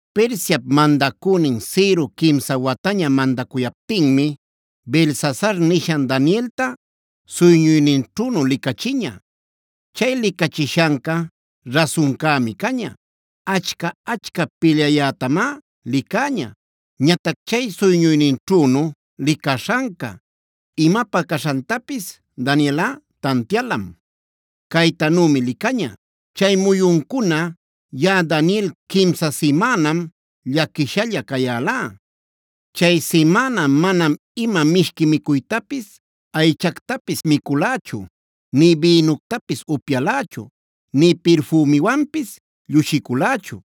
Persiap madacünin Ciro quimsa wataña mandacuyaptinmi Beltsasar nishan Danielta suyñuyninćhünu licachiña. Chay licachishanca rasuncämi caña; achca-achca pilyayätamá licäña. Ñatac chay suyñuyninćhünu licaśhanca imapä caśhantapis Danielꞌa tantialam. Caytanümi licaña: “Chay muyuncuna yaꞌa Daniel quimsa simänam llaquishalla cayälá. Chay simäna manam ima mishqui micuytapis, aychactapis miculächu, nï bïnuctapis upyalächu, nï pirfümiwanpis llushiculächu.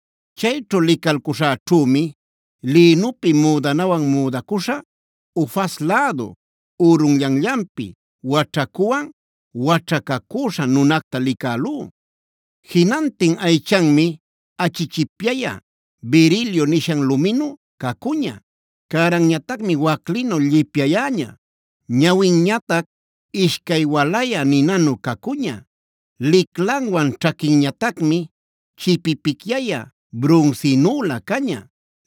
Chayćhu licalcuśhäćhümi lïnupi müdanawan müdacuśha, Ufaz lädu ürunllanllanpi waćhacuwan waćhacacüśha nunacta licälú. Jinantin aychanmi achichipyayä berilio nishan luminu cacuña, cäranñatac waclinu llipyayäña, ñawinñatac ishcay walayä ninanu cacuña. Liclanwan ćhaquinñatacmi chipipicyayä brunsinülä caña.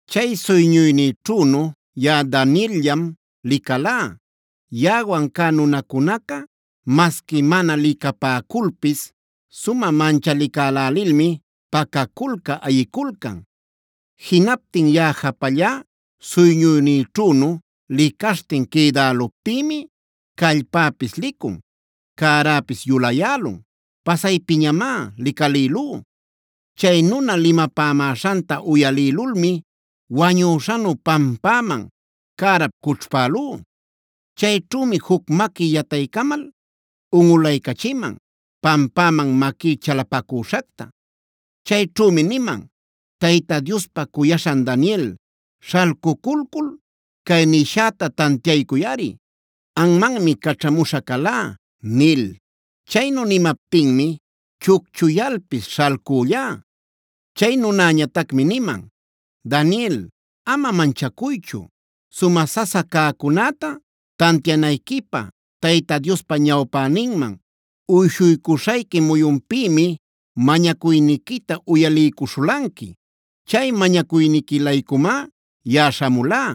“Chay suyñuynïćhünu yaꞌa Daniel-llam licalá. Yaꞌawan cä nunacunaca masqui mana licapäculpis sumä manchalicälälilmi pacaculcä ayiculcan. Jinaptin yaꞌa japallá suyñuynïćhünu licaśhtin quïdäluptïmi callpäpis licun, cäräpis yuläyälun; pasaypiñamá licalïlú. Chay nuna limapämäśhanta uyalïlulmi wañüśhanu pampäman cärap cućhpälú. “Chayćhümi juc maqui yataycamal unꞌulaycachiman, pampäman maquí chalapacüśhacta. Chayćhümi niman: ‘Tayta Diospa cuyaśhan Daniel, śhalcuculcul cay nishäta tantiaycuyꞌari. Anmanmi caćhamuśha calá’ nil. Chaynu nimaptinmi chucchuyalpis śhalcüllá. “Chay nunäñatacmi niman: ‘Daniel, ama manchacuychu. Sumä sasa cäcunäta tantianayquipä Tayta Diospa ñawpäninman uyshuycuśhayqui muyunpïmi mañacuyniquita uyaliycuśhulanqui. Chay mañacuyniqui-laycumá yaꞌa śhamulá.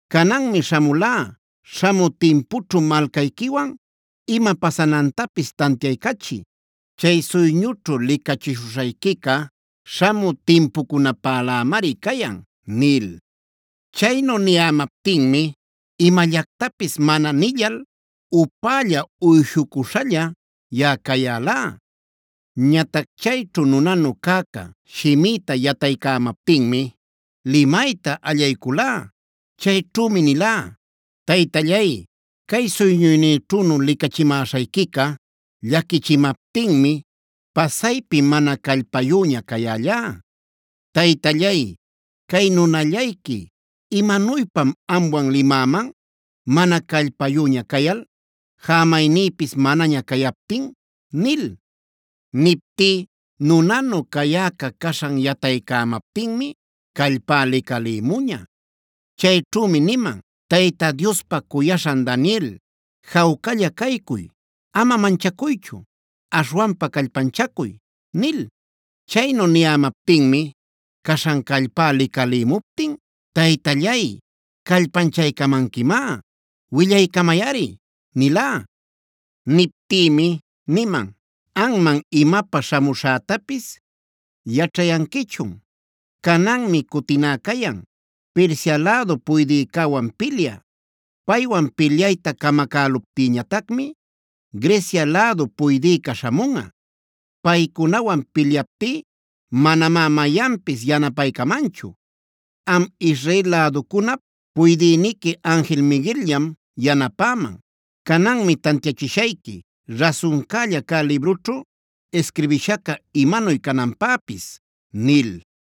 Cananmi śhamulá śhamü timpućhu malcayquiwan ima pasanantapis tantiaycachï. Chay suyñućhu licachishuśhayquica śhamü timpucunapälämari cayan’ nil. “Chaynu niyämaptinmi imallactapis mana nillal upälla uyshucuśhalla yaꞌa cayälá. Ñatac chayćhu nunanu cäca shimïta yataycämaptinmi limayta allayculá. Chayćhümi nilá: ‘Taytallay, cay suyñuynïćhünu licachimäśhayquica llaquichimaptinmi pasaypi mana callpayüña cayällá. Taytallay, cay nunallayqui, ¿imanuypam amwan limäman mana callpayüña cayal, jämaynïpis manaña cayaptin?’ nil. “Niptí, nunanu cayäca caśhan yataycämaptinmi callpá licalïmuña. Chayćhümi niman: ‘Tayta Diospa cuyaśhan Daniel, jawcalla caycuy; ama manchacuychu. Aśhwanpa callpanchacuy’ nil. Chaynu niyämaptinmi caśhan callpá licalïmuptin: ‘Taytallay, callpanchaycamanquimá; willaycamayꞌari’ nilá. “Niptïmi niman: ‘¿Anman, imapä śhamuśhätapis yaćhayanquichun? Cananmi cutiná cayan, Persia lädu puydïcäwan pilyä. Paywan pilyayta camacäluptïñatacmi Grecia lädu puydïca śhamunꞌa. Paycunawan pilyaptí manamá mayanpis yanapaycamanchu; am Israel läducunap puydïniqui anjil Miguel-llam yanapäman. Cananmi tantiachishayqui rasuncälla cä librućhu isquirbishaca imanuy cananpäpis’ nil.